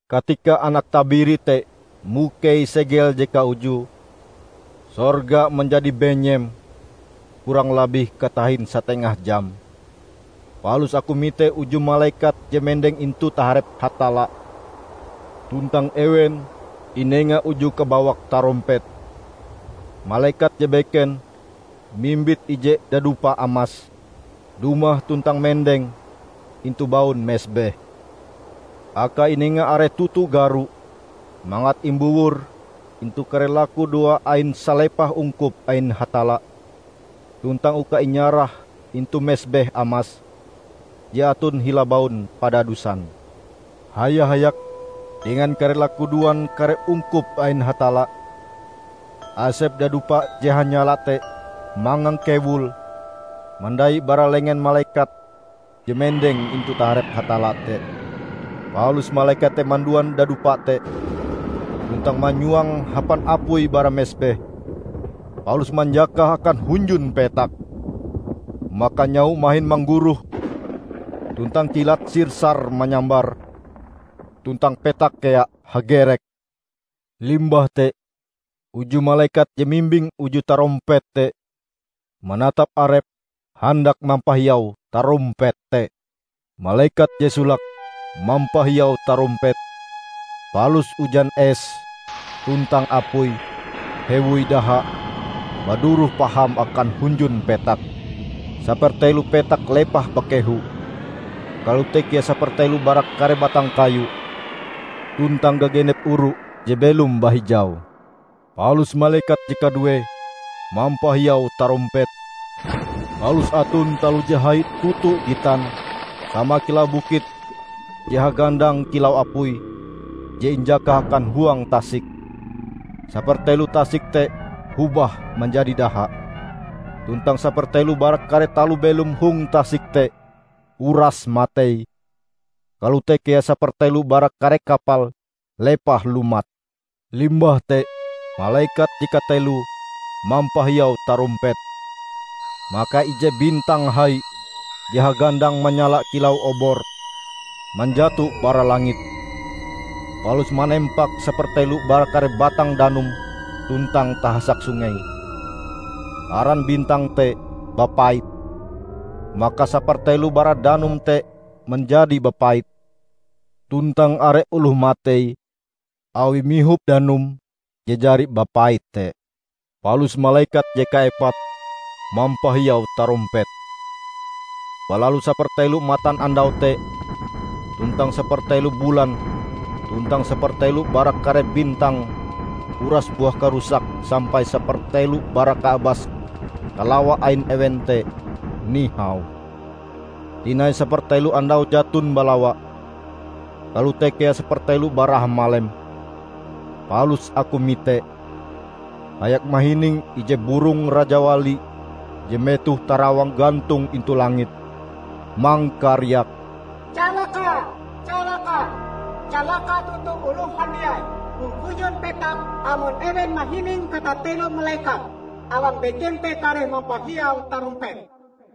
Katika Anak Tabiri te mukei segel je kaujue, sorga manjadi benyem kurang labih katahin satengah jam. Palus aku mite uju malekat je mendeng intu taharep Hatalla, tuntang ewen inenga uju kabawak tarompet. Malekat je beken, mimbit ije dadupa amas, dumah tuntang mendeng intu baun mesbeh. Akae inenga are toto garo mangat imbowor intu kare lakudoa ain salepah ungkup ain Hatalla tuntang uka inyarah intu mesbeh amas je aton hila baun padadusan. Haya-hayak dengan kare lakudoan kare ungkup ain Hatalla, asep dadupa je hanyala te mangangkewul mandai bara lengen malekat je mendeng intu taharep Hatalla te. Palus malekat te manduan dadupa te, tuntang manyuange hapan apui bara mesbeh, palus manjakahe akan hunjun petak. Maka nyaho mahin mangguroh tuntang kilat sir-sar manyambar, tuntang petak kea hagerek. Limbah te, uju malekat je mimbing uju tarompet te manatap arepe handak mampahiau tarompet te. Malekat je solake mampahiau tarompete, palus ujan es tuntang apui hewoi daha baduroh paham akan hunjun petak. Sapertelo petak lepah bakehu; kalote kea sapertelo bara kare batang kayu tuntang gagenep oru je belom bahijau. Palus malekat je kaduee mampahiau tarompete, palus aton taloh je hai toto gitan sama kilau bukit je hagandang kilau apui je injakah akan huang tasik. Sapertelo tasik te hobah manjadi daha. Tuntang sapertelo bara kare taloh belom hong tasik te uras matei; kalote kea sapertelo bara kare kapal lepah lumat. Limbah te malekat je kateloe mampahiau tarompete, maka ije bintang hai, je hagandang manyala kilau obor, manjato bara langit, palus manempak sapertelo bara kare batang danum tuntang tahasak sungei. (Aran bintang te "Bapait".) Maka sapertelo bara danum te manjadi bapait, tuntang are oloh matei awie mihop danum je jari bapait te. Palus malekat je kaepate mampahiau tarompete. Balalu sapertelo matanandau te, tuntang sapertelo bulan tuntang sapertelo bara kare bintang uras buah karusak sampai sapertelo bara kaabas kalawa ain ewen te nihau. Tinai sapertelo andau jaton balawa, kalote kea sapertelo bara hamalem. Palus aku mite, hayak mahining ije burong rajawali je metohe tarawang gantong intu langit, mangkariak, "Calaka! Calaka! Calaka toto oloh handiai hong hunjun petak amon ewen mahining katatelo malekat awang beken te kareh mampahiau tarompete!"